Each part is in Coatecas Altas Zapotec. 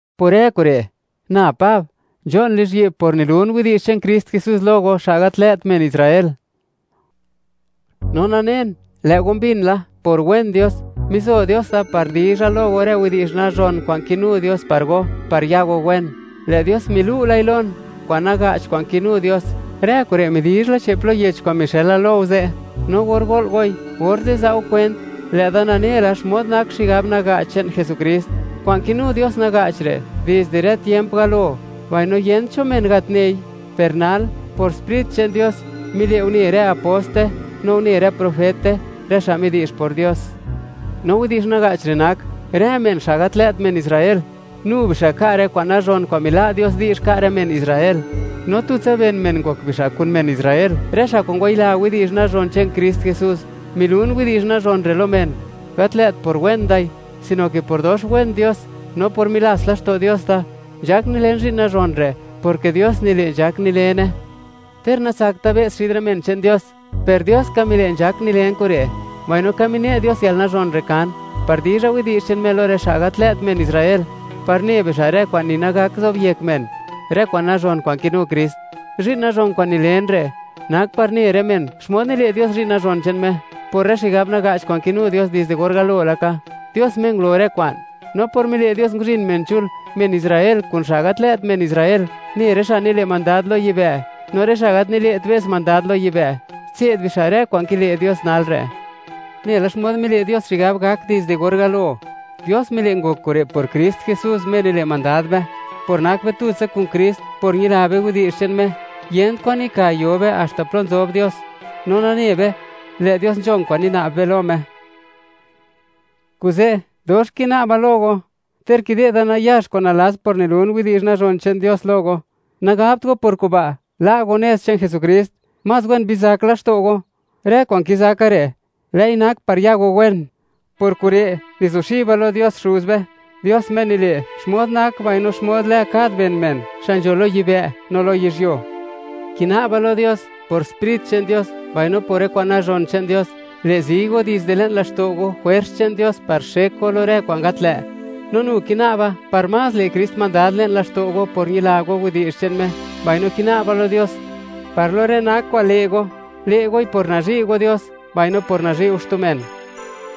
Por rë kure', na Pab, nzho'n lizhyi'b por nilun widi'zh che'n Krist Jesús lo go, xa' gat lë't men Israel. No nanen, lë' go mbin la, por wen Dios, mizo Dios da par dizha lo go rë widi'zh nazhon kwa'n kinu Dios par go, par ya go wen. Lë' Dios milu' lai lon, kwa'n naga'ch kwa'n kinu Dios; rë kure' midizhla che'p lo yech kwa'n mixëla lo go ze'. No or go'l goi, orze' za' go kwent, lë'da nane la xmod nak xigab naga'ch che'n Jesukrist. Kwa'n kinu Dios naga'ch re', dizde rë tiemp galo, mbaino yent cho men gat nei. Per nal, por Sprit che'n Dios, mile' une rë aposte, no une rë profete, rë xa' midi'zh por Dios. No widi'zh naga'ch re' nak: Rë men, xa' gat lë't men Israel, nu bixa' ka' rë kwa'n nazhon kwa'n mila' Dios di'zh ka' rë men Israel, no tutsa ben men ngok bixa' kun men Israel, rë xa' kwa'n ngwayila widi'zh nazhon che'n Krist Jesús. Nilun widi'zh nazhon re' lo men, gat lë't por wen dai, sino ke por dox wen Dios, no por milats laxto' Dios da. Nzhak nilen zhi'n nazhon re', porke Dios nile' nzhak nilene. Ter natsakta' be's xid rë men che'n Dios, per Dios ka mile' nzhak nilen kure', mbaino ka mine' Dios yalnazhon re' kan, par dizha widi'zh che'n Me lo rë xa' gat lë't men Israel, par ne bixa' rë kwa'n ni nagak zobyek men, rë kwa'n nazhon kwa'n kinu Krist. Zhi'n nazhon kwa'n nilen re', nak, par ne rë men, xmod nile' Dios zhi'n nazhon che'n Me, por rë xigab naga'ch kwa'n kinu Dios dizde or galo laka, Dios Me ngulo rë kwa'n; no por mile' Dios, nguzhin men chul, men Israel kun xa' gat lë't men Israel, ne rë xa' nile' mandad lo yibë', no rë xa' gat nile't be's mandad lo yibë', tse'd bixa' rë kwa'n kile' Dios nal re'. Nela xmod mile' Dios xigab gak dizde or galo, Dios mile' ngok kure' por Krist Jesús, Me nile' mandad be. Por nak be tutsa kun Krist, por ñila be widi'zh che'n Me, yent kwan nika yo be haxta plo nzob Dios, no nane be, lë' Dios nzhon kwa'n nina'b be lo Me. Kuze', dox kina'ba lo go, ter kide'da nayax kwa'n nalats por nilun widi'zh nazhon che'n Dios lo go; nagabt go por kuba', la' go nez che'n Jesukrist. Más wen bizak laxto' go; rë kwa'n kizaka re', lë'i nak par ya go wen. Por kure', nizuxiba lo Dios Xuz be, Dios Me nile', xmod nak mbaino xmod lë kad ben men, xa' nzho lo yibë' no lo yizhyuo. Kina'ba lo Dios, por Sprit che'n Dios, mbaino por rë kwa'n nazhon che'n Dios, le' zi go dizde le'n laxto' go, jwers che'n Dios par xek go lo rë kwa'n gat lë'. No nu kina'ba, par más le' Krist mandad le'n laxto' go por ñila go widi'zh che'n Me; mbaino kina'ba lo Dios, par lo rë nak kwa'n le' go, le' goi por nazhi' go Dios, mbaino por nazhi' go xtu men,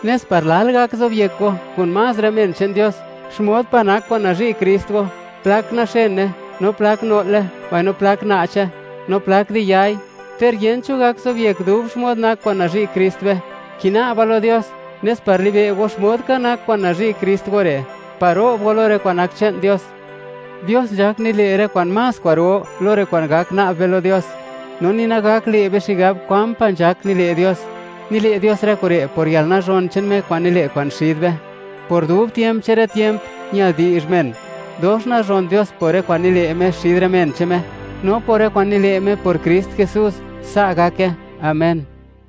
nes par lal gak zobyek go, kun más rë men che'n Dios, xmod pa' nak kwa'n nazhi' Krist go; plak naxene, no plak no'le, mbaino plak na'che, no plak di yai. Ter yent cho gak zobyek dub xmod nak kwa'n nazhi' Krist be, kina'ba lo Dios, nes par libe' go, xmod ka nak kwa'n nazhi' Krist go re', par ro'b go lo rë kwa'n nak che'n Dios. Dios nzhak nile' rë kwa'n más kwa'ro lo rë kwa'n gak na'b be lo Dios, no ni nagak le' be xigab kwan pa' nzhak nile' Dios. Nile' Dios rë kure' por yalnazhon che'n Me kwa'n nile' kwa'n xid be. ¡Por dub tiemp che'n rë tiemp, ñal di'zh men dox nazhon Dios por rë kwa'n nile' Me xid rë men che'n Me, no por rë kwa'n nile' Me por Krist Jesús! Sa' gake. Amén.